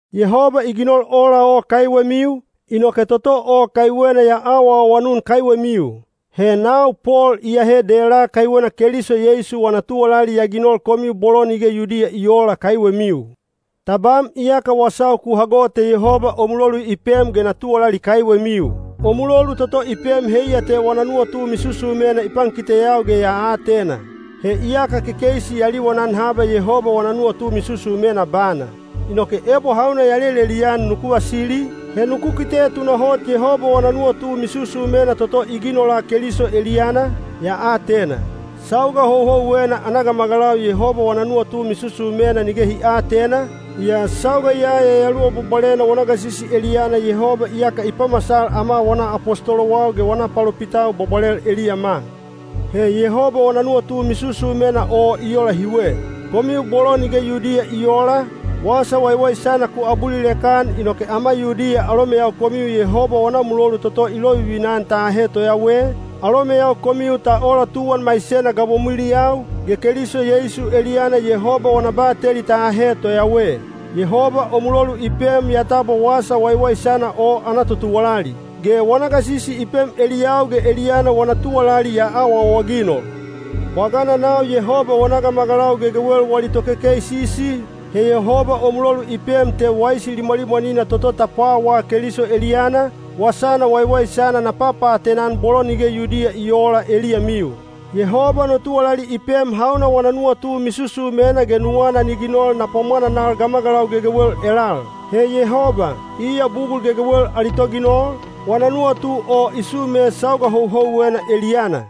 Yehoba i ginol ola o kaiwemiu, inoke toto o kaiwena ya awaawanun kaiwemiu. He nau Pol iyahe dela kaiwena Keliso Yeisu wana tuwalali ya ginol komiu bolo nige Yudiya i oola kaiwemiu. Tabam iyaka ku hago te Yehoba o mulolu i pem ge na tuwalali kaiwemiu. O mulolu toto i pem heiya te wana nuwatu misusumena i pankiteyau ge ya atena. (He iyaka kekeisi ya liwanan haba Yehoba wana nuwatu misusumena bana. Inoke ebo hauna ya lelelian nuku vasili, he nuku kite tunahot Yehoba wana nuwatu misusumena toto i ginola Keliso eliyana, ya atena.) Sauga houhouwena ana gamagalau Yehoba wana nuwatu misusumena nige hi aatena, yaa sauga ya Yayaluwa Bwabwalena wana gasisi eliyana Yehoba iyaka i pamasal ama wana apostolowau ge wana palopitau bwabwalel eliyama. He Yehoba wana nuwatu misusumena o i ola hiwe. Komiu bolo nige Yudiya i oola, Wasa Waiwaisana ku abulilek-an inoke ama Yudiya alomeyau komiu Yehoba wana mulolu toto i lovivina-an ta ahe toyawe, alomeyau komiu ta ola tuwan maisena gabomwiliyau, ge Keliso Yeisu eliyana Yehoba wana bateli ta ahe toyawe. Yehoba o mulolu i pem ya tabwa Wasa Waiwaisana o ana totuwalali. Ge wana gasisi i pem eliyau ge eliyana wana tuwalali ya awaawaginol. Bwagana nau Yehoba wana gamagalau gegewel wali tokekeisisi, he Yehoba o mulolu i pem te waisi limwalimwanina toto ta pwawaa Keliso eliyana, wasana waiwaisana na papaatena-an bolo nige Yudiya i oola eliyamiu. Yehoba no tuwalali i pem hauna wana nuwatu misusumena ge nuwana ni ginol na pwamwananal gamagalau gegewel elal. He Yehoba, iya bugul gegewel ali Toginol, wana nuwatu o i sume sauga houhouwena eliyana.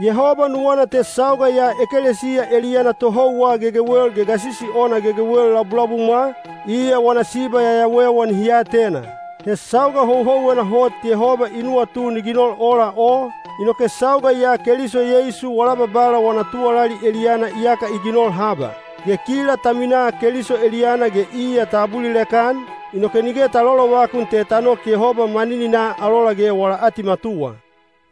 Yehoba nuwana te sauga ya ekelesiya eliyana tohouwa gegewel ge gasisi ona gegewel labulabumwa, iya wana siba yayawewa nihi atena. He sauga houhouwena hot Yehoba i nuwatu ni ginol ola o, inoke sauga ya Keliso Yeisu wala Babala wana tuwalali eliyana iyaka i ginol haba. Ge kila ta minaa Keliso eliyana ge iya ta abulilek-an, inoke nige ta lolovakun te ta nok Yehoba manininaa alola ge wala atimatuwa.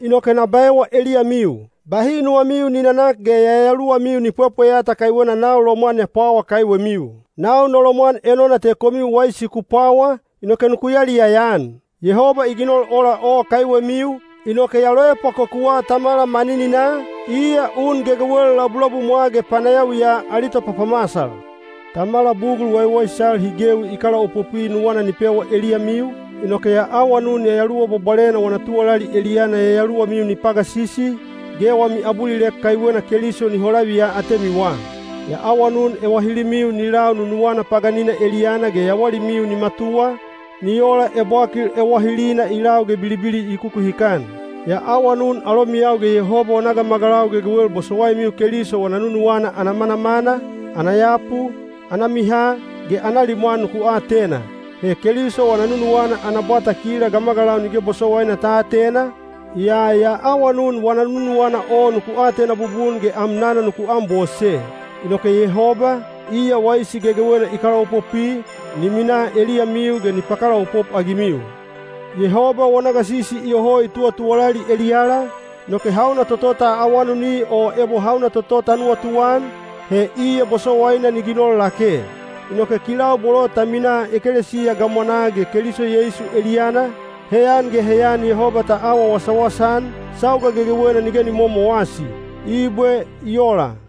Inoke na baewa eliyamiu, bahi nuwamiu ni nanak ge yayaluwamiu ni pwepweyata kaiwena nau lomwan ya pwawa kaiwemiu. Nau no lomwan enona te komiu waisi ku pwawa, inoke nuku yaliyaya-an. Yehoba i ginol ola o kaiwemiu, inoke ya loepwakokuwa Tamala manininaa, iya un gegewel labulabumwa ge panayawiya ali topapamasal. Tamala bugul waiwaisal hi gewi i kalaopopwi nuwana ni pewa eliyamiu, inoke ya awanun Yayaluwa Bwabwalena wana tuwalali eliyana yayaluwamiu ni pagasisi, ge wami abulilek kaiwena Keliso ni holaviya atemiwa. Ya awanun ewahilimiu ni lau nunuwana paganina eliyana ge yawalimiu ni matuwa, ni ola ebwakil ewahilina i lau ge bilibili i kukuhikan. Ya awanun alomiyau ge Yehoba wana gamagalau gegewel bosowaimiu Keliso wana nunuwana ana manamana, ana yapu, ana miha, ge ana limwan nuku atena. He Keliso wana nunuwana ana bwata kila gamagalau nige bosowaina ta atena, yaa ya awanun wana nunuwana o nuku atena bubun ge amnana nuku anbose. Inoke Yehoba, iya waisi gegewena i kalaopopwi, ni minaa eliyamiu ge ni pakalaopop-agimiu. Yehoba wana gasisi iyoho i tuwatuwalali eliyala, inoke hauna toto ta awanuni o ebo hauna toto ta nuwatuan, he iya bosowaina ni ginol lake. Inoke kilau bolo ta minaa ekelesiya gamwanaa ge Keliso Yeisu eliyana, heyan ge heyan Yehoba ta awa wasawasa-an, sauga gegewena nige ni momowasi. Ibwe. I ola.